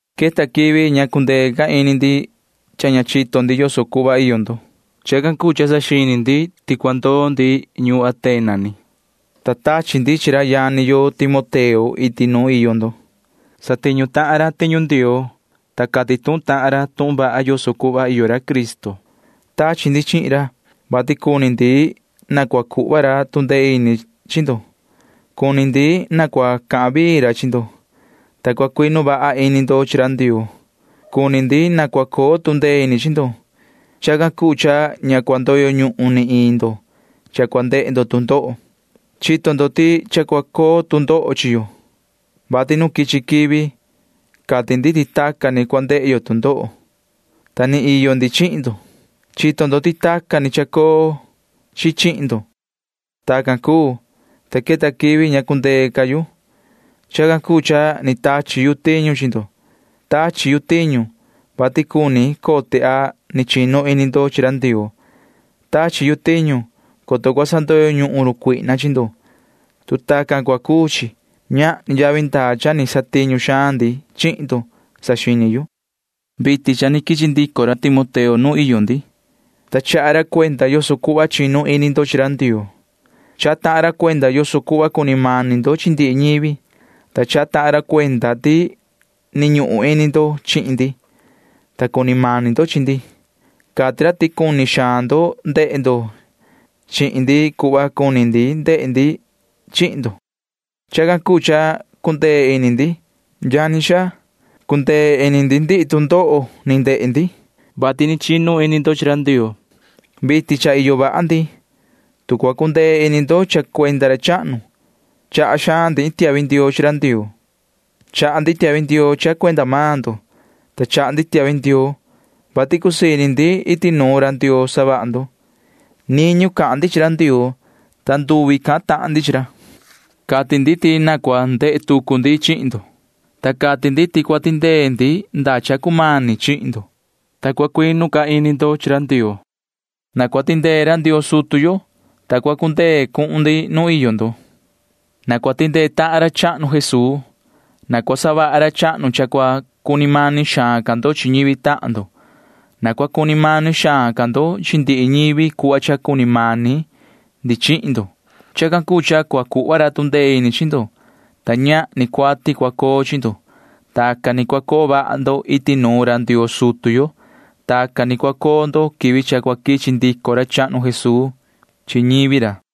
Queta quivi ña ni cuu ca cundee ini ndi cha ña chito ndi yoso cuhva iyo ndo. Chacan cuu cha saxini ndi ti cua ndoo mani yu ñuun Atena, ta tachi ndi chi ra yani yo Timoteo iti nuun iyo ndo. Satiñu tahan ra tiñu Ndioo, ta cati tuhun tahan ra tuhun vaha yoso cuhva iyo ra Cristo. Tachi ndi chihin ra, vati cuni ndi na cua cuhva ra tu ndee ini chi ndo. Cuni ndi na cua cahan vii ra chi ndo, ta cua cuinu vaha ini ndo chi ra Ndioo. Cuni ndi na cua coo tu ndee ini chi ndo. Chacan cuu cha ña cua ndoyo ñuhun ni iin ndo cha cua ndehe ndo tu ndoho. Chito maan ndo ti cha cua coo tu ndoho chi yo, vati nu quichi quivi cati ndi ti tacan ni cua ndehe yo tu ndoho, ta ni iyo ndi chihin ndo. Chito ndo ti tacan ni chacoo chi chihin ndo. Tacan cuu, ta queta quivi ña cundee ca yu. Chacan cuu cha ni tachi yu tiñu chi ndo. Tachi yu tiñu, vati cuni cote a ni chinu ini ndo chi ra Ndioo. Tachi yu tiñu, coto cua sandoyo ñuhun run cuihna chi ndo. Tu tacan cua cuu chi, ñahni yavi ndaa cha ni satiñu xaan ndi chihin ndo, [saxini yu]. Vitin cha ni quichi ndico ra Timoteo nuun iyo ndi, ta chaha ra cuenda yoso cuhva chinu ini ndo chi ra Ndioo. Chaha tahan ra cuenda yoso cuhva cuni mani ndo chi ndihi ñivi, ta chaha tahan ra cuenda ti ni ñuhun ini ndo chi ndi, ta cuni mani ndo chi ndi. Cati ra ti cuni xaan ndo ndehe ndo chihin ndi cuhva cuni ndehe ndi chihin maan ndo. Chacan cuu cha cundee ini ndi, yani xaa. Cundee ini ndi ndihi tu ndoho ni ndehe ndi, vati ni chinu ini ndo chi ra Ndioo. Vitin cha iyo vaha ndi, tu cua cundee ini ndo cha cuenda ra chahnu. Chaha xaan ndi iin tiahvi ndioo chi ra Ndioo. Chaha ndi tiahvi ndioo cha cuenda maan ndo, ta chaha ndi tiahvi ndioo, vati cusii ini ndi iti nuun ra Ndioo savaha ndo. Niñu cahan ndi chi ra Ndioo, ta nduvi cahan tahan ndi chi ra. Cati ndi ti na cua ndehe tucu ndi chihin ndo, ta cati ndi ti na cua tindee ndi ñaan cha cumani chihin ndo, ta cua cuinu vaha ca ini ndo chi ra Ndioo. Na cua tindee ra Ndioo sutu yo, ta cua cundee cuhun ndi nuun iyo ndo. Na cua tindee tahan ra chahnu Jesuu. Na cua savaha ra chahnu cha cua cuni mani xaan ca ndo chi ñivi tahan ndo. Na cua cuni mani xaan ca ndo chi ndihi ñivi cuhva cha cuni mani ndi chihin ndo. Chacan cuu cha cua cuhva ra tu ndee ini chi ndo, ta ñahni cuati cua coo chi ndo. Tacan ni cua coo vaha ndo iti nuun ra Ndioo sutu yo. Tacan ni cua coo ndo quivi cha cua quichi ndico ra chahnu Jesuu chi ñivi ra.